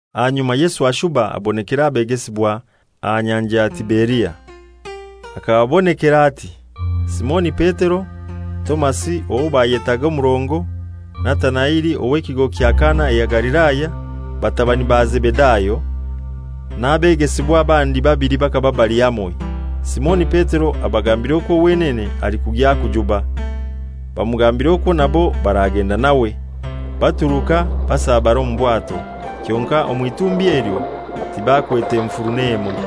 Ahanyuma Yesu ashuba abonekera abegesibwa aha Nyanja ya Tiberia; hakababonekera ati: Simoni Petero, Tomasi owo bayetaaga Omurongo, Natanaeli ow'ekigo kya Kana eya Galilaya, batabani ba Zebedayo, n'abegesibwa abandi babili bakaba bali hamoi. Simoni Petero abagambira okwo wenene alikugya kujuba. Bamugambira okwo nabo baragenda nawe. Baturuka basabara omu bwato, kyonkai omw'itumbi elyo tibakwete nfuru n'emoi.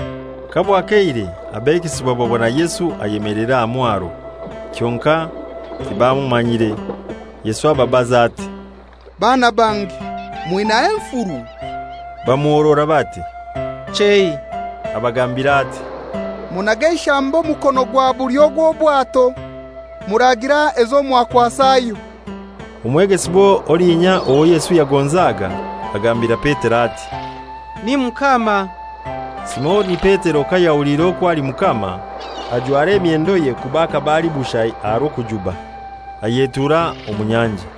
Kabwakeire abegesibwa babona Yesu ayemeleire aha mwaro, kyonkai tibamumanyire. Yesu ababaza ati, «Baana bange, mwinaiho enfuru?» Bamuhorora bati, «Chei.» Abagambira ati, «Munage eishambo mukono ogwa bulyo gw'obwato, muragira ezo mwakwasayo.» Omwegesibwa olinya owo Yesu yagonzaga agambira Petero ati, «Ni Mukama!» Simoni Petero kayahuliire okwo ali Mukama, ajwara emyendoye kuba hakaba ali bushai aha rw'okujuba, ayetuura omu nyanja.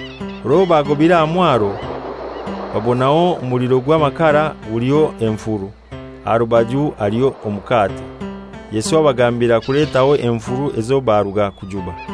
Orwo bagobire aha mwaro babonaho omuliro gw'amakara guliho enfuru, aha rubaju haliho omukate. Yesu abagambira kuletaho enfuru ezo baruga kujuba.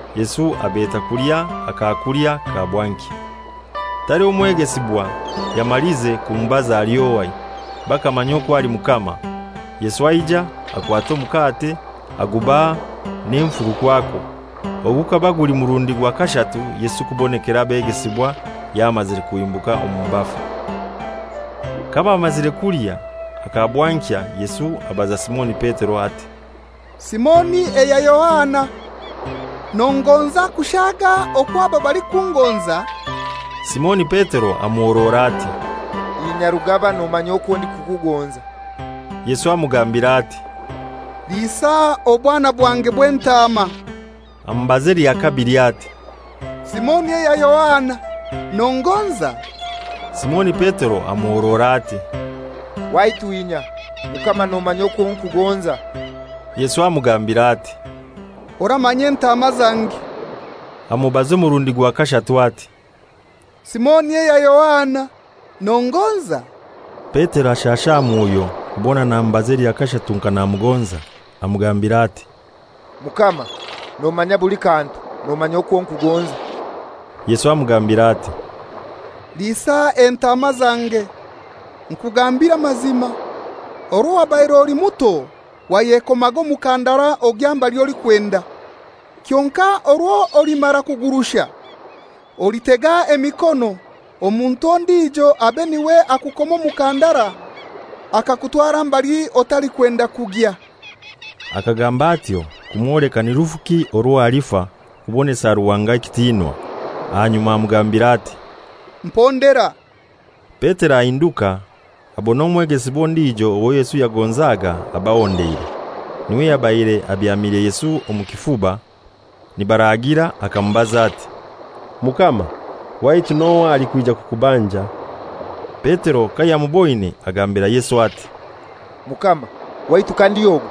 Yesu abeta kulya akakulya ka bwankya. Taliho mwegesibwa yamalize kumubaza ali ohai. Bakamanya okwo ali Mukama. Yesu aija, akwata omukate agubaha, n'enfuru kwakwo. Ogu gukaba guli murundi gwa kashatu Yesu kubonekera abegesibwa yamazire kuhimbuka omu bafu. Kabamazire kulya aka bwankya, Yesu abaza Simoni Petero ati, «Simoni eya Yohana, nongonza kushaaga okwo aba balikungonza?» Simoni Petero amuhorora ati, «Inya Rugaba, nomanya okwo ndikukugonza.» Yesu amugambira ati, «Liisa obwana bwange bw'entaama.» Amubaza elya kabili ati, «Simoni eya Yohana, nongonza?» Simoni Petero amuhorora ati, «Waitu inya, Mukama; nomanya okwo nkugonza.» Yesu amugambira ati, «Oramanya entaama zange.» Amubaza omurundi gwa kashatu ati, «Simoni eya Yohana, nongonza?» Petero ashasha aha mwoyo kubona namubaza elya kashatu nka namugonza. Amugambira ati, «Mukama, nomanya buli kantu; nomanya okwo nkugonza.» Yesu amugambira ati, «Liisa entaama zange. Nkugambire amazima, orwo wabaire oli muto wayekomaga omukandara ogya mbali olikwenda. Kyonkai orwo olimara kugurusha, olitega emikono, omuntu ondijo abe n'iwe akukoma omukandara akakutwara mbali otalikwenda kugya.» (Akagamba atyo kumwoleka ni rufuki orwo alifa kubonesa Ruhanga ekitinwa). Ahanyuma amugambira ati, «Mpondera.» Petero ahinduka abona omwegesibwa ondijo owo Yesu yagonzaga abahondeire, n'iwe yabaire abyamire Yesu omu kifuba nibaraagira akamubaza ati, «Mukama, waitu n'ohai alikwija kukubanja?» Petero kayamuboine agambira Yesu ati, «Mukama, waitu kandi ogu?»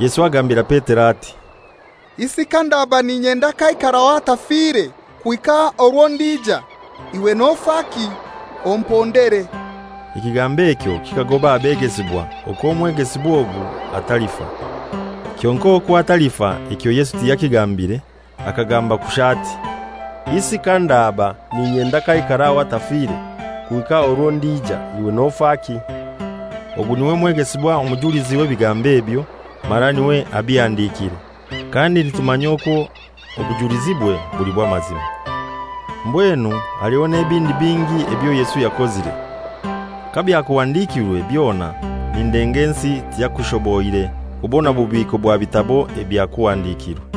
Yesu agambira Petero ati, «Isi kandaba n'inyenda k'aikaraho atafire kuhika orwo ndija, iwe nofaki? Ompondere!» Ekigambo ekyo kikagoba abegesibwa okwo omwegesibwa ogu atalifa. Kyonkai okwo atalifa ekyo Yesu tiyakigambire, akagamba kushai ati, «Isi kandaba n'inyenda k'aikaraho atafire kuhika orwo ndija, iwe nofaki?» Ogu n'iwe mwegesibwa omujulizi w'ebigambo ebyo, mara n'iwe abihandikire; kandi nitumanya okwo obujulizibwe buli bw'amazima. Mbwenu aliho n'ebindi bingi ebyo Yesu yakozire. Kabyakuhandikirwe byona nindenga ensi tiyakushoboire kubona bubiiko bwa bitabo ebyakuhandikirwe.